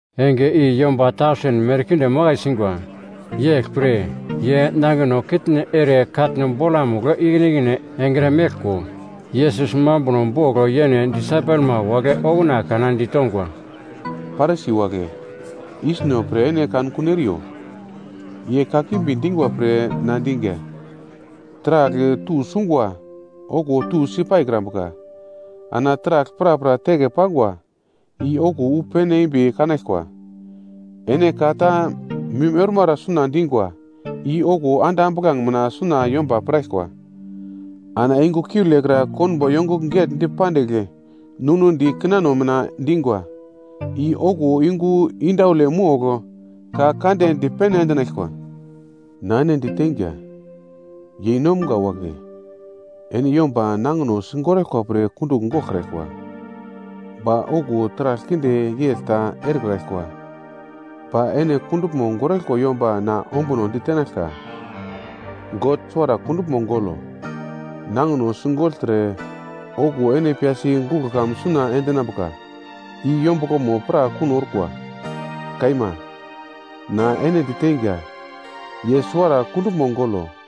Enge i yomba tausen merkinde makai singwa, yeglpre, ye nangino kitne ere katno bolamugl ikine ikine engre meglko, Yesus mambuno bogl yene disaipelma wagle okuna kana ditongwa, “Parisi wagle yisno pre ene kankun eriyo ye kakimbi dingwa pre na dinga. Taragl tusungwa, okuwo tusi paikrambuka. Ana taragl prapra teke pangwa i okuwo wu pene embi kanaglkwa. Ene ka ta mim ormara suna dingwa i okuwo ande ambuglange mina suna yomba piraglkwa. Ana yungu kiule kra konbo yongugl getndi pandigl ninudi kinano mina dingwa i okuwo yungu indaule mogl ka kande dipene endinaglkwa. “Na ene diteinga, yeinomga wagle ene yomba nangino sigoraglkwa pre kundugl goglkraglkwa, ba okuwo taragl kinde yegl ta erekraglkwa. Ba ene kunduglmo goraglkwa yomba na ombuno ditenaglka. God suwara kunduglmo golo, nangino sigogltre, okuwo ene piyasi guglo kamun suna endinambuka i yombuglomo pra kuno orkwa. Kaima, na ene diteinga, ye suwara kunduglmo golo.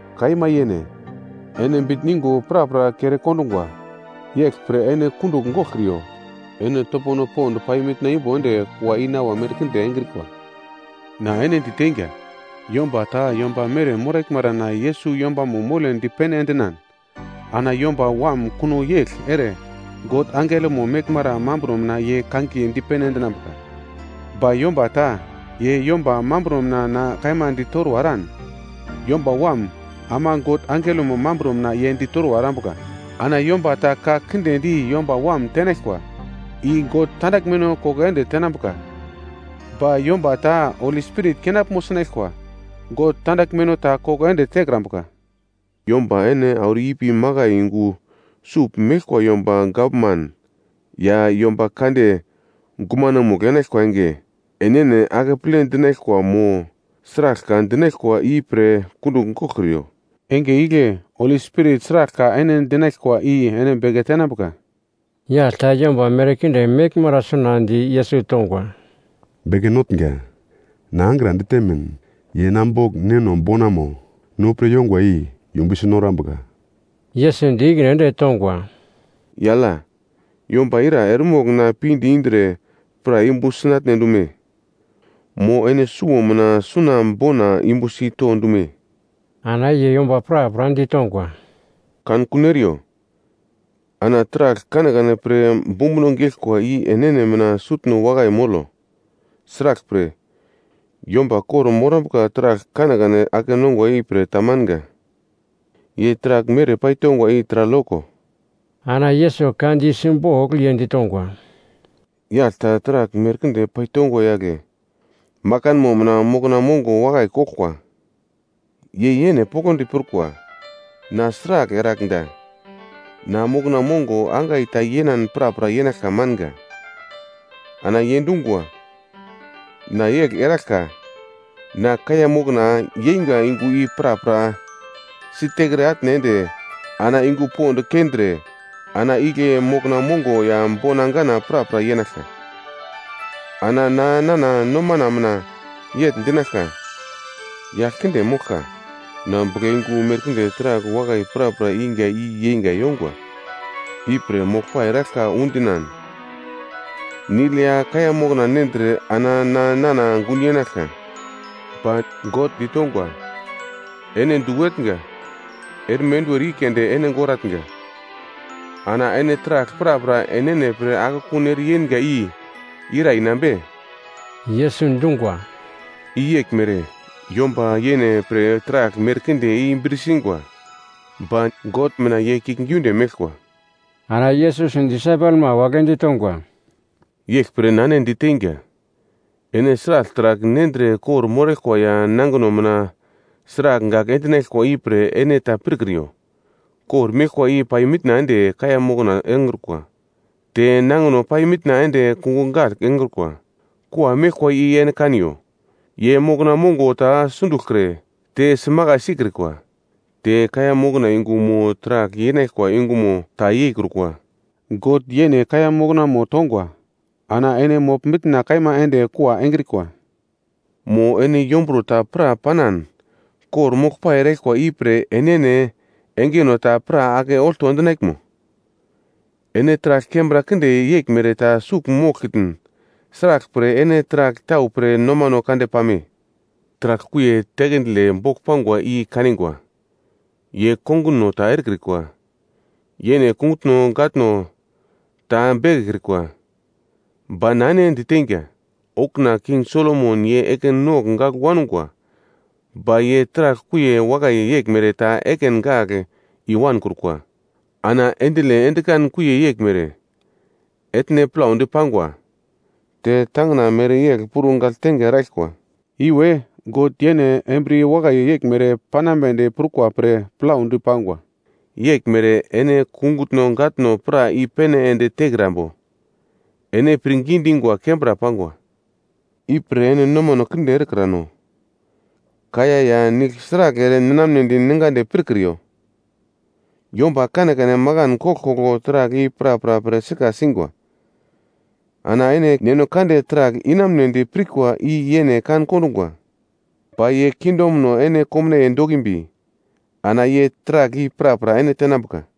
Kaima yene, ene bitn yungo prapra kere kondungwa. Yeglpre ene kundugl goglkriyo, ene topono pond pai mitna imbo ende kua inawa merkinde engrikwa. “Na ene diteinga, yomba ta yomba mere moraglmara na Yesus yombamo mole dipene endinan ana Yomba Wam kuno yegl ere God angelomo meglmara mambro mina ye kangiye dipene endinambuka. Ba yomba ta ye yomba mambro mina na kaima ditorwa eran, Yomba Wam ama God angelomo mambro mina ye ditorwa erambuka. Ana yomba ta ka kinde di Yomba Wam tenaglkwa, i God tandaglmeno koko ende tenambuka. Ba yomba ta Holi Spirit kenaglmo sinaglkwa, God tandaglmeno ta koko ende tekrambuka. “Yomba ene auro ipi makai yungu sugl meglkwa yomba gavman ya yomba kande gumanomugl enaglkwa enge, enene akeple dinaglkwa mo, sragl ka dinaglkwa ipre kundugl goglkriyo. Enge igle Holi Spirit sragl ka ene dinaglkwa i ene beke tenambuka.” Yagl ta yomba merkinde meglmara suna di Yesus tongwa, “Beke Notnga, na angra ditemin ye na bogl neno bonamo, no pre yongwa i yumbusi norambuka.” Yesus di ikine ende tongwa, “Yagl ya, yomba ira eremogl na pinde indre pra yumbu sinatne dume, mo ene suwo mina suna bona yumbusi to dume?” Ana ye yomba prapra ditongwa, “Kankun eriyo! Ana taragl kanekane pre bumbuno geglkwa i enene mina sutno wakai molo. Sraglpre, yomba kor-morambuka taragl kanekane ake nongwa ipre ta manga, ye taragl mere paitongwa i taragl yoko.” Ana Yesus ka di simbogl ye ditongwa, “Yagl ta taragl merkinde paitongwa yagle, makanmo mina mokna mongo wakai koglkwa. Ye yene poglodi prukwa, ‘Na sragl eragl da? Na mokna mongo angai ta yenan prapra yenaglka manga.’ “Ana ye dungwa, ‘Na yegl eraglka, na kaiya mokna yeinga yungu i prapra siterke atne ende ana yungu pond keindre, ana igle mokna mongo ya bona ganana prapra yenaglka. Ana na nana nomana mina yegl dinaglka, “Yagl kinde moglka, na buglayungu merkinde taragl wakai prapra inga i yeinga yongwa. Ipre moglpai eraglka undinan, nigl ya kaiya mokna nendre ana na nana gun yenaglka.” ’ “Ba God ditongwa, ‘Ene du etnga! Erme enduwer i keunde ene goratnga, ana ene taragl prapra enene pre akekun ere yenga i ira inambe?’” Yesus dungwa, “I yeglmere yomba yene pre taragl merkinde i bir singwa. Ba God mina ye kiuglgiunde meglkwa.” Ana Yesus disaipelma wagle ditongwa, “Yeglpre na ene diteinga, ene sragl taragl nendre kor-moraglkwa ya nangino mina sragl gagl endinaglkwa ipre ene ta pirkriyo. Kor meglkwa i pai mitna ende kaiya mokna engrukwa, te nangino pai mitna ende kungugl gagl engrukwa. Kua meglkwa i ene kaniyo, ye mokna mongo ta sunduglkre, te simakai sikrikwa, te kaiya mokna yungu mo taragl yenaglkwa yungumo ta yeikrukwa. God yene kaiya moknamo tongwa ana ene mogl mitna kaima ende kua engrikwa. Mo ene yomburo ta pra panan kor-moglpai eraglkwa i pre enene engeno ta pra ake olto endinaglmo? Ene taragl kembra kinde yeglmere ta sugl moglkitn sraglpre ene taragl tau pre nomano kande pame? “Taragl kuiye tekendile bogl pangwa i kanigwa, ye konguno ta erekrikwa, yene kungutno gatno ta bekekrikwa. Ba na ene diteinga, okuna King Solomon ye ekin nogl gagl wangwa, ba ye taragl kuiye wakai yeglmere ta ekin gagl i-wankrukwa. Ana akindile endikan kuiye yeglmere, etne plaudi pangwa, te tangina mereyegl puro gagltenge eraglkwa, iwe God yene embriye wakai yeglmere panambedi prukwa pre plaudi pangwa. Yeglmere ene kungutno gatno pra i-pene ende tekrambo? Ene pirngi dingwa kembra pangwa! Ipre ene nomano kinde erekrano, kaiya ya nigl sragl ere ninamnedi ningadi pirkriyo. Yomba kane kane makan koglkoglo taragl i prapra pre sika singwa. Ana ene Neno Kande taragl inamunedi pirkwa i ye kan kondungwa. Ba ye kingdomo ene komnaiye dokimbi ana ye taragl i prapra ene tenambuka.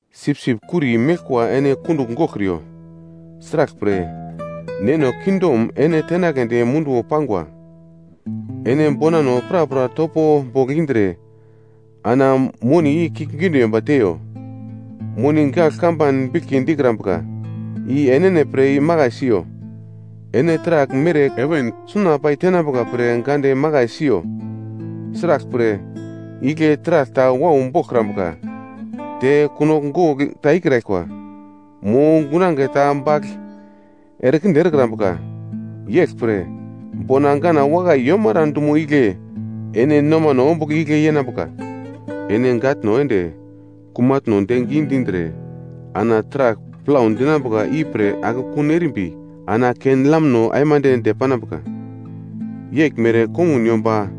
“Sipsip kuri meglkwa ene kundugl goglkriyo. Sraglpre Neno kingdom ene tenagledi munduwo pangwa. Ene bonano prapra topo bogl indre ana moni i kiuglgiunde yomba teiyo. Moni gagl kamban biglki dikrambuka i enene pre imakai siyo, ene taragl mere heven suna paitenambuka pre gande makai siyo. Sraglpre igle taragl ta wau boglkrambuka, te kunogl gogl ta ikraglkwa, mo gunange ta bagl erekinde erekrambuka. Yeglpre, bona ganan wakai yomara dumo igle ene nomano ombugl igle yenambuka. “Ene gatno ende kumatno de gidindre ana taragl plau dinambuka ipre akekun erimbi ana ken-lamno aimande depanambuka. Yeglmere kongun yomba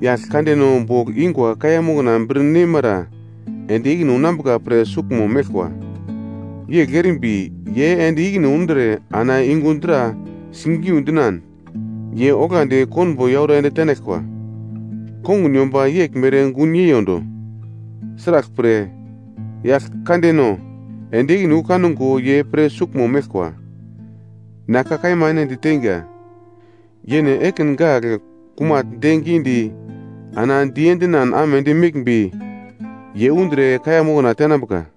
yagl kandeno bogl ingwa kaiya mokna bir neimara ende ikine unambuka pre suglmo meglkwa, yegl erimbi ye ende ikine undre ana yungu dra sigiu dinan, ye oglandi konbo yauro ende tenaglkwa. Kongun yomba yeglmere gun yeiyondo, sraglpre yagl kandeno ende ikine wu kango ye pre suglmo meglkwa. Na ka kaima ene diteinga, yene ekin gagl kumagl de gidi ana diendinan amedi meglmbi ye undre kaiya mokna tenambuka.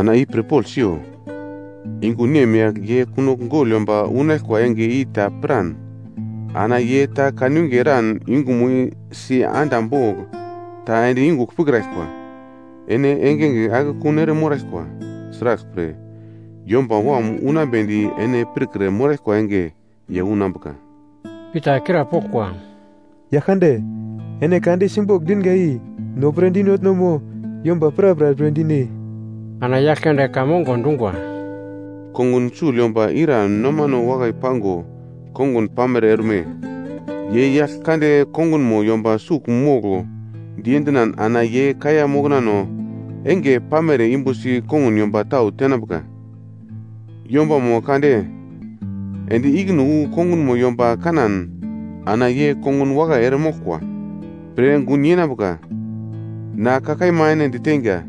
Ana i pirpogl siyo. Yungu nemyagl ye kunogl gogl yomba unaglkwa enge i ta piran ana ye ta kanwinge eran yungumo si anda bogl ta ende yungugl pirkraglkwa. Ene engenge akekun ere moraglkwa. Sraglpre, Yomba Wam unambedi ene pirkre moraglkwa enge ye unambuka.” Pita krapoglkwa, “Yaglkande, ene ka di simbogl dinga i no pre dinotno mo, yomba prapra pre dine?” Ana Yaglkande ka mongo dungwa, “Kongun sugl yomba ira nomano wakai pango kongun pamere orme? Ye yagl kande kongunmo yomba sugl moglo diendinan ana ye kaiya moknano enge pamere yumbusi kongun yomba tau tenambuka. Yombamo kande ende ikine wu kongunmo yomba kanan ana ye kongun wakai eremoglkwa pre gun yenambuka. Na ka kaima ene diteinga,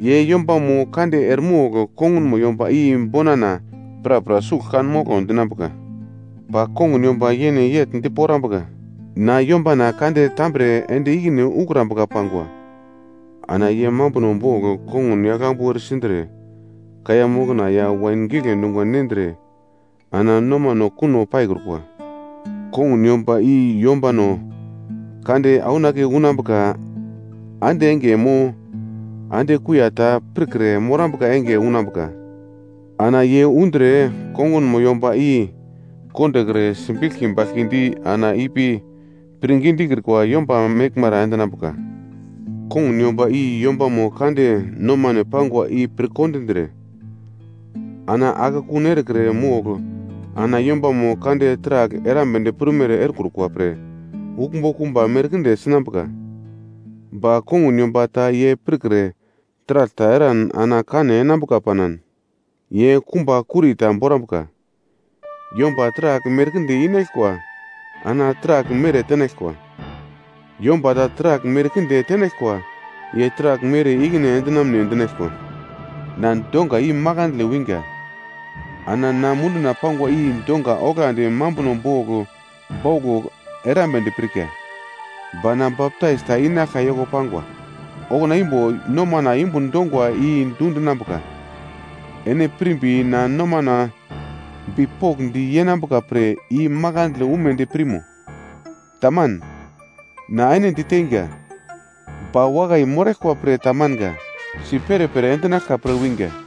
ye yombamo kande eremogl kongunmo yomba i bonana, prapra sugl kan moglo dinambuka. Ba kongun yomba yene yegl diporambuka, ‘Na yombana kande tambre ende ikine ukrambuka pangwa.’ Ana ye mambuno bogl kongun yaglambu eresindre kaiya mokna ya wain gigle dungwa nendre ana nomano kuno paikrukwa. Kongun yomba i yombano kande aunake unambuka ande enge mo ande kuiya ta pirkre morambuka enge unambuka. Ana ye undre kongunmo yomba i kondokre sibiglki baglki di ana ipi pirngi dikrikwa yomba meglmara endinambuka. “Kongun yomba i yombamo kande nomane pangwa i pir kondindre, ana akekun erekre mogl ana yombamo kande taragl erambedi prumere erekrukwa pre uglmbo kumba merkinde sinambuka. Ba kongun yomba ta ye pirkre taragl ta eran ana kane enambuka panan ye kumba kuri ta borambuka. Yomba taragl merkinde inaglkwa ana taragl mere tenaglkwa. Yomba ta taragl merkinde tenaglkwa ye taragl mere ikine endinamne dinaglkwa. “Na donga i makandle winga ana na munduna pangwa i donga oglandi mambuno bogl bauglo erambedi pirka. Ba na baptais ta inaglka yoko pangwa, okuna imbo nomana yumbun dongwa i dundinambuka. Ene pirmbi na nomano bipokndi yenambuka pre i makandle umedi pirmo? Taman. Na ene diteinga, ba wakai moraglkwa pre ta manga, si perepere endinaglka pre winga.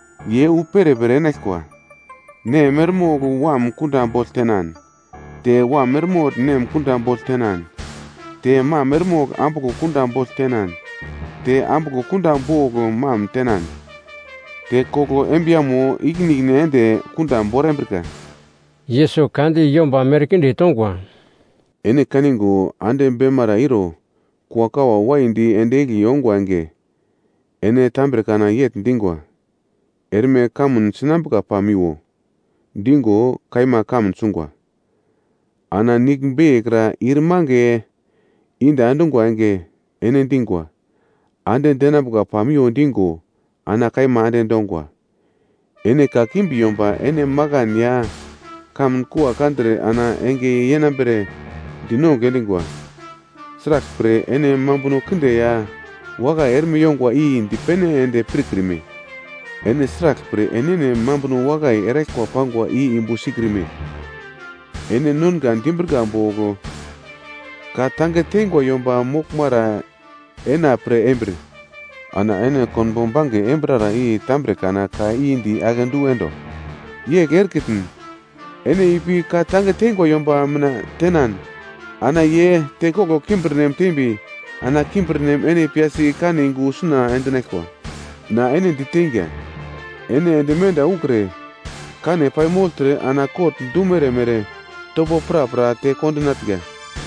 Ye wu perepere enaglkwa, nem eremogl wam kunda bogl tenan te wam eremogl nem kunda bogl tenan te mam eremogl ambuglo kunda bogl tenan te ambuglo kunda bogl mam tenan, te koglo embiyamo ikine ikine ende kunda borambrika.” Yesus ka di yomba merkinde tongwa, “Ene kaningo ande beimara iro kuakawa waidi ende egli ongwa enge, ene tambre kana yegl dingwa, ‘Erme kamun sinambuka pamiwo’ dingo? Kaima, kamun sungwa. Ana nigl beiye kra ir mange inda endungwa enge ene dingwa, ‘Ande denambuka pamiwo’ dingo, ana kaima ande dongwa. Ene kakimbi yomba ene makan ya kamun kua kandre ana enge yenambere dinongugl endingwa. Sraglpre ene mambuno kinde ya wakai erme yongwa i dipene ende pirkrime? “Ene sraglpre enene mambuno wakai eraglkwa pangwa i yumbu sikrime? Ene nonga dimbrika bogl ka tange teingwa yomba moglmara ena pre embir, ana ene konbo bange enambrara i tambre kana ka i di akedu endo. Yegl erekitn ene ipi ka tange teingwa yomba mina tenan ana ye tekoglo kimbirnem tembi ana kimbirnem ene piyasi kane yungu suna endinaglkwa. Na ene diteinga, ene ende menda ukre kane paimogltre ana kot dumere mere topo prapra te kondinatnga.”